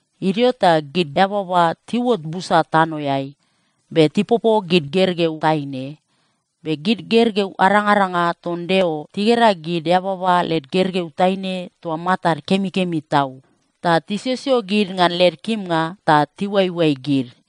Idio ta gid eababa tiuot busa tanoeai, be tipopo gid gergeu taine. Be gid gergeu arangaranga ton Deo tigera gid eababa led gergeu taine toa matad kemikemi tau. Ta tisiosio gid ngan led kimnga ta tiuaioai gid.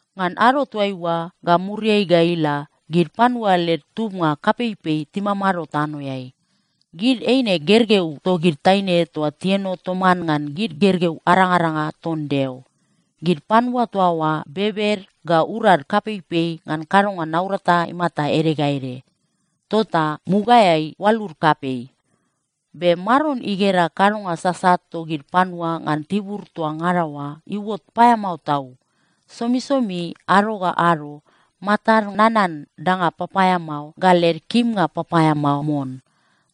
Ngan ado toaiua ga muriai ga ila, gid panua led tubnga kapeipei timamado tanoeai. Gid eine gergeu togid taine toa tieno toman ngan gid gergeu arangaranga ton Deo. Gid panua toa oa bebed ga urad kapeipei ngan kadonga naurata imata ede ga ede. Tota mugaeai oalud kapei. Be Maron igera kadonga sasat togid panua ngan tibur toa ngada oa iuot paeamao tau. Somisomi ado ga ado matad nanan danga papaeamao ga led kimnga papaeamao mon.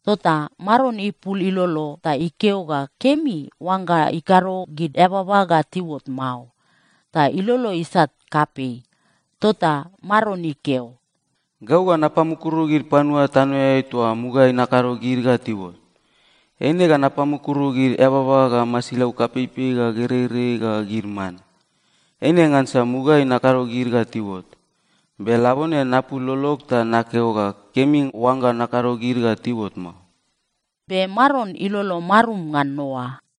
Tota Maron ipul ilolo ta ikeo ga kemi oangga ikado gid eababa ga tiuot mao. Ta ilolo isat kapei. Tota Maron ikeo, “Gau ga napamukuru gid panua tanoeai toa mugaeai nakado gid ga tiuot. Eine ga napamukuru gid eababa ga masilau kapeipei ga gereirei ga gid man. Eine ngansa mugaeai nakado gid ga tiuot, be labone napul lolog ta nakeo ga kemi oangga nakado gid ga tiuot mao.” Be Maron ilolo marum ngan Noa.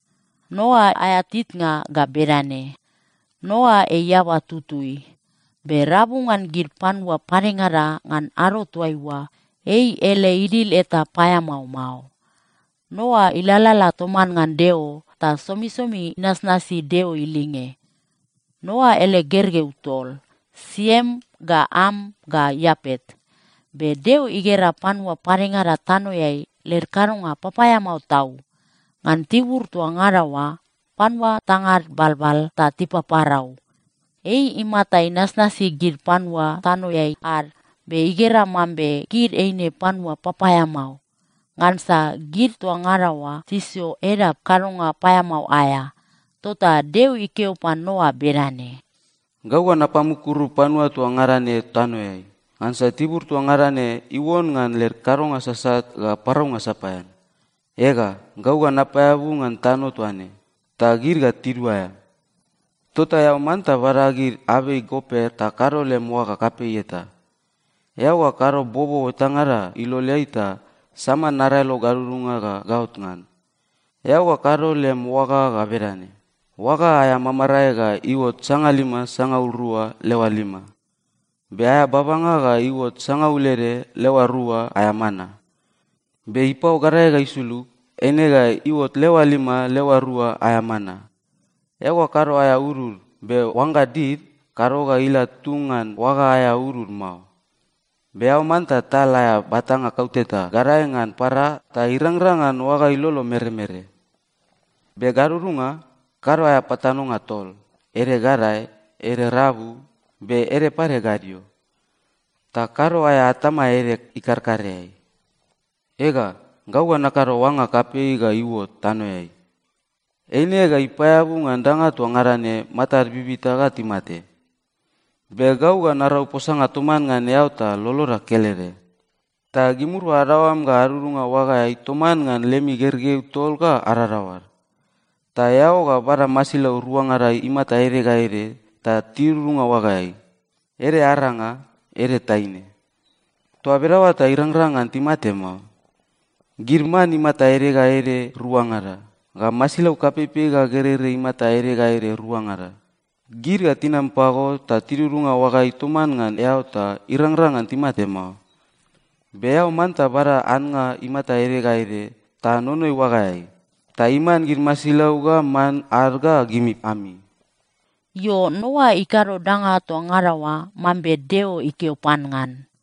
Noa aea titnga ga bedane: Noa ei eaba tutui. Be rabu ngan gid panua padengada ngan ado toaiua, ei ele idil eta paeamao mao. Noa ilalala toman ngan Deo ta somisomi inasnasi Deo ilinge. Noa ele gergeu tol, Siem ga Am ga Iapet. Be Deo igera panua padengada tanoeai led kadonga papaeamao tau. Ngan tibur toa ngada oa panua tangad balbal ta tipaparau. Ei imata inasnasi gid panua tanoeai ad be igera mambe gid eine panua papaeamao, ngansa gid toa ngada oa tisio edap kadonga paeamao aea. Tota Deo ikeo pan Noa bedane, “Gau ga napamukuru panua toa ngada ne tanoeai, ngansa tibur toa ngada ne iuon ngan led kadonga sasat ga paraunga sapaean. Ega, gau ga napaeabu ngan tano toa ne, ta gid ga tiduaea. Tota eao manta bada gid abei goper ta kado lem oaga kapei eta. Eao ga kado bobo etangada iloleai ta sama naraelo gadudunga ga gaot ngan. Eao ga kado lem oaga ga bedane: Oaga aea mamarae ga iuot sangalima sangaul rua leoa lima. Be aea babanga ga iuot sangaul ede leoa rua aea mana. Be ipao gadae ga isulug, eine ga iuot leoa lima leoa rua aea mana. Eao ga kado aea udud. Be oangga did, kado ga ila tung ngan oaga aea udud mao. Be eao manta tal aea batanga kauteta gadae ngan para ta irangrang ngan oaga ilolo meremere. Be gadudunga, kado aea patanonga tol, ede gadae, ede rabu, be ede pade gadio. Ta kado aea atama ede ikarkareai. “Ega, gau ga nakado oanga kapei ga iuot tanoeai. Eine ga ipaeabu ngan danga toa ngada ne matad bibita ga timate. Be gau ga narau posanga toman ngan eao ta loloda kelede. Ta gimirua adaoam ga adudunga oagaeai toman ngan lemi gergeu tol ga adadaoad. Ta eao ga bada masilau ruangada imata ede ga ede ta tidudunga oagaeai, ede aranga, ede taine. Toa bedaoa ta irangrang ngan timate mao. Gid man imata ede ga ede ruangada, ga masilau kapeipei ga gereirei imata ede ga ede ruangada, gid ga tinam pago ta tidudunga oagaeai toman ngan eao ta irangrang ngan timate mao. Be eao manta bada annga imata ede ga ede ta nonoi oagaeai, ta iman gid masilau ga man ad ga gimi ami.” Io, Noa ikado danga toa ngada oa mambe Deo ikeo pan ngan.